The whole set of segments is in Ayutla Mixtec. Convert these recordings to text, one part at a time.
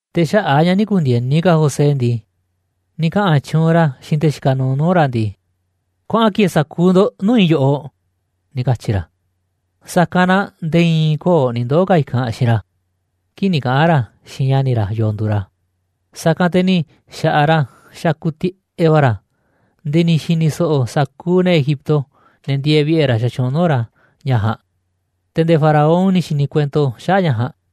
Te̱ xaꞌa̱ꞌ a̱ ña̱ nï̱ ku̱ndi̱e̱ni ka̱ José ndii, ni̱ kaꞌa̱n tyuunꞌ ra̱ xiinꞌ te̱ xikaꞌ nuuꞌ nuu̱ꞌ ra̱ ndii: ―Kuaꞌan ki̱e̱e̱ sa̱kuuꞌ ndo̱ꞌ nuu̱ꞌ i̱ yoꞌoꞌ ―ni̱ katyi̱ ra̱. Sa̱kanꞌ na nde̱e̱ i̱i̱n köo̱ꞌ ni̱ ndoo̱ ka̱ i̱kanꞌ xiinꞌ ra̱, kii̱ꞌ ni̱ kaꞌa̱n ra̱ xiinꞌ ña̱ni̱ ra̱ yo̱o̱ nduuꞌ ra̱. Sa̱kanꞌ te̱ ni̱ xa̱ꞌaꞌ ra̱ xakuꞌ tiꞌeꞌ va̱ ra̱, nde̱e̱ ni̱ xi̱ni̱ so̱ꞌo̱ sa̱kuuꞌ ne̱ Egipto, ne̱ ndieeꞌ vi̱ꞌe̱ ra̱ xatyuunꞌ nuu̱ꞌ ra̱ ña̱ ja̱a̱nꞌ, te̱ nde̱e̱ Faraón ni̱ xi̱ni̱ kuento xaꞌa̱ꞌ ña̱ ja̱a̱nꞌ.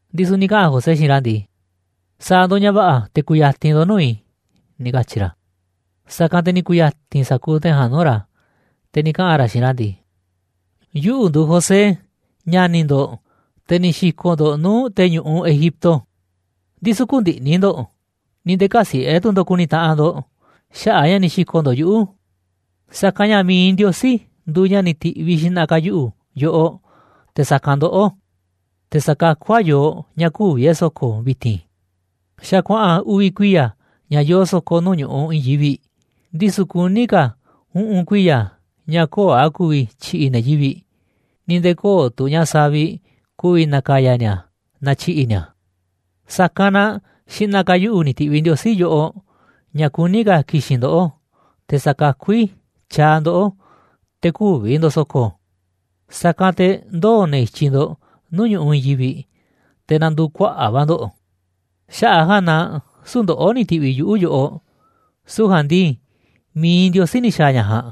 Ndisu̱ ni̱ kaꞌa̱n José xiinꞌ ra̱ ndii: ―Sa̱a̱ ndo̱ꞌ ña̱ va̱ꞌa̱ te̱ ku̱ya̱ti̱n ndo̱ꞌ nuu̱ꞌ i̱ ―ni̱ katyi̱ ra̱. Sa̱kanꞌ te̱ ni̱ ku̱ya̱ti̱n sa̱kuuꞌ te̱ ja̱a̱nꞌ nuu̱ꞌ ra̱, te̱ ni̱ kaꞌa̱n ra̱ xiinꞌ ra̱ ndii: ―Yuꞌu̱ nduuꞌ José, ña̱ni̱ ndo̱ꞌ, te̱ ni̱ xi̱ko̱ꞌ ndo̱ꞌ nuu̱ꞌ te̱ ñu̱ꞌuꞌ Egipto. Ndisu̱ kü̱ndi̱ꞌni̱ ndo̱ꞌ, ni̱ nde̱e̱ kä̱siꞌe̱ tu̱ ndo̱ꞌ ku̱ni̱ taꞌanꞌ ndo̱ꞌ xaꞌa̱ꞌ a̱ ña̱ ni̱ xi̱ko̱ꞌ ndo̱ꞌ yuꞌu̱, sa̱kanꞌ ña̱ mi̱iꞌ Ndiosí nduuꞌ ña̱ ni̱ ti̱ꞌviꞌ xi̱ꞌna̱ ka̱ yuꞌu̱ yoꞌoꞌ te̱ sa̱kanꞌ ndoꞌó, te̱ sa̱kakú a̱ yooꞌ ña̱ kü̱vi̱ e̱ꞌ so̱ko̱ vi̱ti̱n. Xa̱ kuaꞌa̱n uvi̱ kuiya̱ ña̱ yoo so̱ko̱ nuu̱ꞌ ñu̱ꞌuꞌ i̱i̱n yivi̱ꞌ, ndisu̱ kuní ka̱ uꞌu̱n kuiya̱ ña̱ köo̱ꞌ a̱ ku̱vi̱ tyi̱ꞌi̱ ne̱ yivi̱ꞌ, ni̱ nde̱e̱ köo̱ꞌ tu̱ ña̱ savi̱ꞌ ku̱vi̱ na̱ka̱ya̱ ni̱a̱ naaꞌ tyi̱ꞌi̱ ni̱a̱. Sa̱kanꞌ na xi̱ꞌna̱ ka̱ yuꞌu̱ ni̱ ti̱ꞌviꞌ Ndiosí yoꞌoꞌ ña̱ kuní ka̱ ki̱xi̱n ndoꞌó, te̱ sa̱kakú i̱ tyaaꞌ ndoꞌó te̱ kü̱vi̱ ndo̱ꞌ so̱ko̱, sa̱kanꞌ te̱ ndoo̱ ne̱ i̱tyiꞌ ndo̱ꞌ nuu̱ꞌ ñu̱ꞌuꞌ i̱i̱n yivi̱ꞌ, te̱ na̱ndu̱u̱ kuaꞌa̱ꞌ va̱ ndo̱ꞌ. Xaꞌa̱ꞌ a̱ ja̱a̱nꞌ na süu̱ꞌ ndoꞌó ni̱ ti̱ꞌviꞌ yuꞌu̱ yoꞌoꞌ, süu̱ꞌ ja̱a̱nꞌ ndii mi̱iꞌ Ndiosí ni̱ xa̱a̱ ña̱ ja̱a̱nꞌ,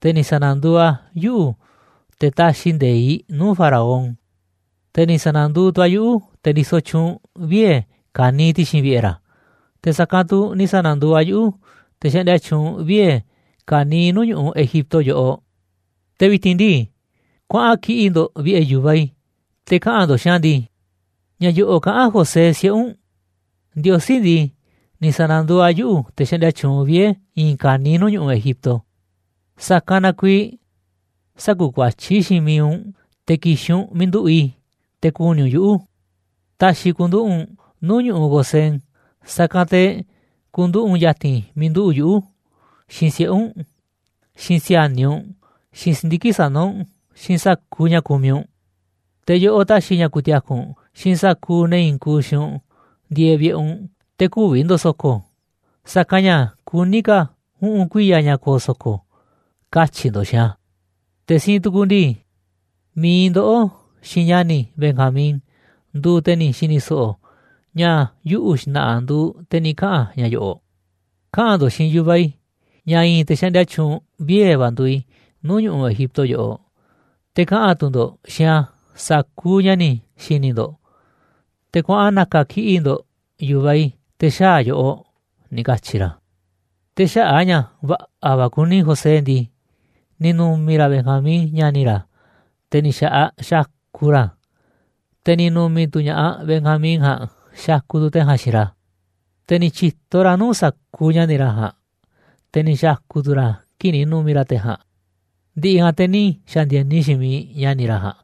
te̱ ni̱ sa̱na̱nduuꞌ a̱ yuꞌu̱ te̱ taxiꞌ nde̱iꞌ nuu̱ꞌ Faraón, te̱ ni̱ sa̱na̱nduuꞌ tu̱ a̱ yuꞌu̱ te̱ ndisoꞌ tyuunꞌ vie̱ ka̱niiꞌ ti̱xi̱n vi̱ꞌe̱ ra̱, te̱ sa̱kanꞌ tu̱ ni̱ sa̱na̱nduuꞌ a̱ yuꞌu̱ te̱ xaꞌndia tyuunꞌ vie̱ ka̱niiꞌ nuu̱ꞌ ñu̱ꞌuꞌ Egipto yoꞌoꞌ. Te̱ vi̱ti̱n ndii, kuaꞌan kiꞌi̱ꞌ ndo̱ꞌ vi̱ꞌe̱ yu̱vaꞌ i̱, te̱ kaꞌa̱n ndo̱ꞌ xiinꞌ a̱ ndii: “Ña̱ yo̱ꞌo̱ kaꞌán José siꞌe̱ u̱nꞌ: “Ndiosí ndii, ni̱ sa̱na̱nduuꞌ a̱ yuꞌu̱ te̱ xaꞌndia tyuunꞌ vie̱ i̱i̱n ka̱niiꞌ nuu̱ꞌ ñu̱ꞌuꞌ Egipto. Sa̱kanꞌ na kuiiꞌ sä̱ku̱kuatyí xiinꞌ miiꞌ u̱nꞌ te̱ ki̱xi̱n u̱nꞌ miiꞌ nduꞌu̱ꞌ i̱, te̱ ku̱ni̱ u̱nꞌ yuꞌu̱. Ta̱xi̱ i̱ ku̱nduꞌu̱ꞌ u̱nꞌ nuu̱ꞌ ñu̱ꞌuꞌ Gosén, sa̱kanꞌ te̱ ku̱nduꞌu̱ꞌ u̱nꞌ ya̱ti̱n miiꞌ nduꞌu̱ꞌ yuꞌu̱, xiinꞌ siꞌe̱ u̱nꞌ, xiinꞌ si̱a̱niꞌ u̱nꞌ, xiinꞌ si̱ndiki̱ꞌ sana̱ u̱nꞌ, xiinꞌ sa̱kuuꞌ ña̱ kumiꞌ u̱nꞌ. Te̱ yoꞌoꞌ ta̱xi̱ i̱ ña̱ ku̱ti̱a̱ku̱ u̱nꞌ, xiinꞌ sa̱kuuꞌ ne̱ i̱i̱n kuuꞌ xiinꞌ u̱nꞌ ndieeꞌ vi̱ꞌe̱ u̱nꞌ te̱ kü̱vi̱ ndo̱ꞌ so̱ko̱, sa̱kanꞌ ña̱ kuní ka̱ uꞌu̱n kuiya̱ ña̱ ko̱o̱ so̱ko̱,” katyi̱ ndo̱ꞌ xiinꞌ a̱. Te̱ siinꞌ tu̱ku̱ ndii, mi̱iꞌ ndoꞌó xiinꞌ ña̱ni̱ i̱ Benjamín nduuꞌ te̱ ni̱ xi̱ni̱ so̱ꞌo̱ ña̱ yuꞌu̱ xna̱ꞌa̱ nduuꞌ te̱ ni̱ kaꞌa̱n ña̱ yo̱ꞌo̱. Kaꞌa̱n ndo̱ꞌ xiinꞌ yu̱vaꞌ i̱ ña̱ i̱i̱n te̱ xaꞌndia tyuunꞌ vie̱ va̱ nduuꞌ i̱ nuu̱ꞌ ñu̱ꞌuꞌ Egipto yoꞌoꞌ, te̱ kaꞌa̱n tu̱ ndo̱ꞌ xiinꞌ a̱ sa̱kuuꞌ ña̱ ni̱ xi̱ni̱ ndo̱ꞌ. Te̱ kuaꞌan na̱ka̱ kiꞌi̱ꞌ ndo̱ꞌ yu̱vaꞌ i̱ te̱ xaa̱ a̱ yoꞌoꞌ ―ni̱ katyi̱ ra̱. Te̱ xaꞌa̱ꞌ a̱ ña̱ va̱ꞌa̱ va̱ kuni José ndii, ni̱ nu̱mi̱ ra̱ Benjamín, ña̱ni̱ ra̱, te̱ ni̱ xa̱ꞌaꞌ xakuꞌ ra̱, te̱ ni̱ nu̱mi̱ tu̱ ña̱ꞌaꞌ Benjamín ja̱a̱nꞌ xakuꞌ tu̱ te̱ ja̱a̱nꞌ xiinꞌ ra̱. Te̱ ni̱ tyi̱to ra̱ nuu̱ꞌ sa̱kuuꞌ ña̱ni̱ ra̱ ja̱a̱nꞌ, te̱ ni̱ xa̱ku̱ tu̱ ra̱ kii̱ꞌ ni̱ nu̱mi̱ ra̱ te̱ ja̱a̱nꞌ, ndi̱ꞌi̱ ja̱a̱nꞌ te̱ ni̱ xa̱ndi̱e̱ni xiinꞌ miiꞌ ña̱ni̱ ra̱ ja̱a̱nꞌ,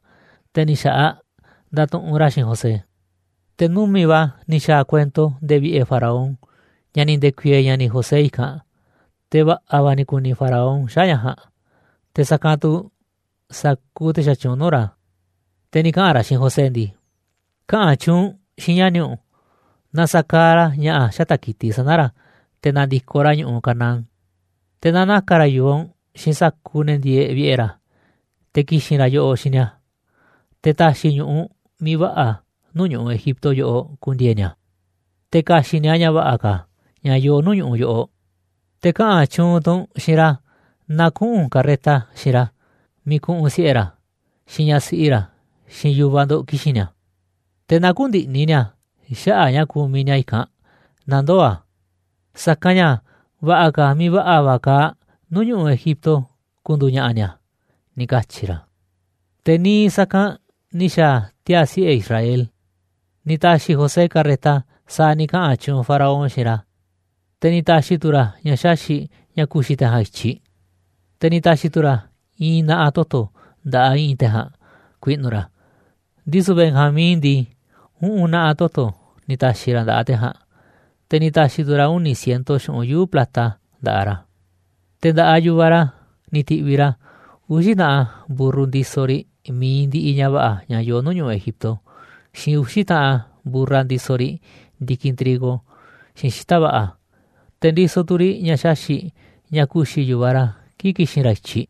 te̱ ni̱ xa̱ꞌaꞌ ndatuꞌunꞌ ra̱ xiinꞌ José. Te̱ numi̱ꞌ va̱ ni̱ xa̱a̱ kuento nde̱e̱ vi̱ꞌe̱ Faraón ña̱ ni̱ nde̱ku̱i̱e̱e̱ ña̱ni̱ José i̱kanꞌ. Te̱ va̱ꞌa̱ va̱ ni̱ ku̱ni̱ Faraón xaꞌa̱ꞌ ña̱ ja̱a̱nꞌ, te̱ sa̱kanꞌ tu̱ sa̱kuuꞌ te̱ xatyuunꞌ nuu̱ꞌ ra̱. Te̱ ni̱ kaꞌa̱n ra̱ xiinꞌ José ndii: ―Kaꞌa̱n tyuunꞌ u̱nꞌ xiinꞌ ña̱ni̱ u̱nꞌ na sa̱kaaꞌ ra̱ ña̱ꞌa̱ xata̱ꞌ ki̱tiꞌ sana̱ ra̱ te̱ na̱ndi̱koꞌ ra̱ ñu̱ꞌuꞌ Canaán. Te̱ na na̱ka̱ ra̱ yu̱vaꞌ u̱nꞌ xiinꞌ sa̱kuuꞌ ne̱ ndieeꞌ vi̱ꞌe̱ ra̱, te̱ ki̱xi̱n ra̱ yoꞌoꞌ xiinꞌ ni̱a̱, te̱ ta̱xi̱ i̱ ñu̱ꞌuꞌ miiꞌ va̱ꞌa̱ nuu̱ꞌ ñu̱ꞌuꞌ Egipto yoꞌoꞌ ku̱ndi̱e̱e̱ ni̱a̱, te̱ ka̱xi̱ꞌ ni̱a̱ ña̱ va̱ꞌa̱ ka̱, ña̱ yoo nuu̱ꞌ ñu̱ꞌuꞌ yoꞌoꞌ. Te̱ kaꞌa̱n tyuunꞌ tu̱ u̱nꞌ xiinꞌ ra̱ na kuꞌu̱n karreta xiinꞌ ra̱ miiꞌ ku̱ꞌu̱n siꞌe̱ ra̱, xiinꞌ ñaꞌ siꞌi ra̱, xiinꞌ yu̱vaꞌ ndo̱ꞌ ki̱xi̱n ni̱a̱. Te̱ na kü̱ndi̱ꞌni̱ ni̱a̱ xaꞌa̱ꞌ ña̱ kumiꞌ ni̱a̱ i̱kanꞌ naaꞌ ndoo̱ a̱, sa̱kanꞌ ña̱ va̱ꞌa̱ ka̱ miiꞌ va̱ꞌa̱ va̱ kaaꞌ nuu̱ꞌ ñu̱ꞌuꞌ Egipto ku̱ndu̱u̱ ña̱ꞌa̱ ni̱a̱ ―ni̱ katyi̱ ra̱. Te̱ niiꞌ sa̱kanꞌ ni̱ xa̱a̱ tiaa̱ siꞌe̱ Israel. Ni̱ ta̱xi̱ José carreta sa̱a̱ ni̱ kaꞌa̱n tyuunꞌ Faraón xiinꞌ ra̱, te̱ ni̱ ta̱xi̱ tu̱ ra̱ ña̱ xaxi̱ꞌ ña̱ ku̱xi̱ te̱ ja̱a̱nꞌ i̱tyiꞌ. Te̱ ni̱ ta̱xi̱ tu̱ ra̱ i̱i̱n na̱ꞌa̱ toto̱ nda̱ꞌaꞌ i̱ꞌi̱n te̱ ja̱a̱nꞌ ku̱i̱ꞌnu̱ ra̱, ndisu̱ Benjamín ndii, uꞌu̱n na̱ꞌa̱ toto̱ ni̱ ta̱xi̱ ra̱ nda̱ꞌaꞌ te̱ ja̱a̱nꞌ, te̱ ni̱ ta̱xi̱ tu̱ ra̱ uni̱ ciento xu̱ꞌunꞌ yuu̱ꞌ plata nda̱ꞌaꞌ ra̱. Te̱ nda̱ꞌaꞌ yu̱vaꞌ ra̱ ni̱ ti̱ꞌviꞌ ra̱ uxi̱ taꞌan mburru ndisoꞌ riꞌ mi̱iꞌ ndiꞌiꞌ ña̱ va̱ꞌa̱ ña̱ yoo nuu̱ꞌ ñu̱ꞌuꞌ Egipto, xiinꞌ uxi̱ taꞌan mburra ndisoꞌ riꞌ ndi̱kinꞌ trigo xiinꞌ xita̱ꞌ va̱ꞌa̱, te̱ ndisoꞌ tu̱ riꞌ ña̱ xaxi̱ꞌ ña̱ ku̱xi̱ yu̱vaꞌ ra̱ kii̱ꞌ ki̱xi̱n ra̱ i̱tyiꞌ.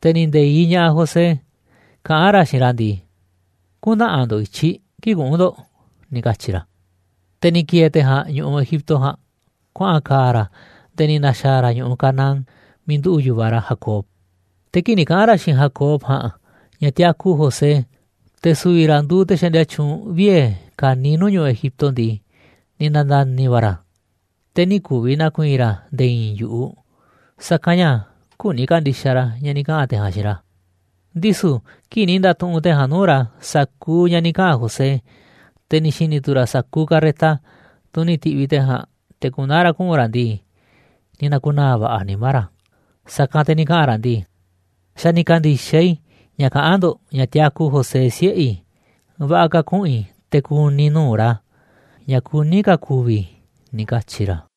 Te̱ ni̱ nde̱iꞌ ña̱ꞌaꞌ José kaꞌán xiinꞌ ra̱ ndii: ―Kü̱ntaꞌanꞌ ndo̱ꞌ i̱tyiꞌ kii̱ꞌ kuꞌu̱n ndo̱ꞌ ―ni̱ katyi̱ ra̱. Te̱ ni̱ ki̱e̱e̱ te̱ ja̱a̱nꞌ ñu̱ꞌuꞌ Egipto ja̱a̱nꞌ kuaꞌa̱n ka̱a̱ ra̱ nde̱e̱ ni̱ na̱xa̱a̱ ra̱ ñu̱ꞌuꞌ Canaán miiꞌ nduꞌu̱ꞌ yu̱vaꞌ ra̱ Jacob. Te̱ kii̱ꞌ ni̱ kaꞌa̱n ra̱ xiinꞌ Jacob ja̱a̱nꞌ ña̱ tiaku José, te̱ su̱vi̱ ra̱ nduuꞌ te̱ xaꞌndia tyuunꞌ vie̱ ka̱niiꞌ nuu̱ꞌ ñu̱ꞌuꞌ Egipto ndii, ni̱ na̱nda̱ni̱ va̱ ra̱, te̱ nï̱ ku̱vi̱ na̱ku̱i̱i̱n ra̱ nde̱e̱ i̱i̱n yu̱ꞌuꞌ, sa̱kanꞌ ña̱ küni ka̱ndi̱xaꞌ ra̱ ña̱ ni̱ kaꞌa̱n te̱ ja̱a̱nꞌ xiinꞌ ra̱. Ndisu̱ kii̱ꞌ ni̱ nda̱tuꞌunꞌ te̱ ja̱a̱nꞌ nuu̱ꞌ ra̱ sa̱kuuꞌ ña̱ ni̱ kaꞌa̱n José, te̱ ni̱ xi̱ni̱ tu̱ ra̱ sa̱kuuꞌ carreta, tunꞌ ni̱ ti̱ꞌviꞌ te̱ ja̱a̱nꞌ te̱ ku̱naa̱ ra̱ kuꞌu̱n ra̱ ndii, ni̱ na̱ku̱naa̱ va̱ꞌa̱ nimá ra̱. Sa̱kanꞌ te̱ ni̱ kaꞌa̱n ra̱ ndii: ―Xa̱ ni̱ ka̱ndi̱xaꞌ i̱ ña̱ kaꞌán ndo̱ꞌ ña̱ tiaku José siꞌe̱ i̱, va̱ꞌa̱ ka̱ kuꞌu̱n i̱ te̱ ku̱ni̱ i̱ nuu̱ꞌ ra̱, ña̱ kuní ka̱ ku̱vi̱ i̱ ―ni̱ katyi̱ ra̱.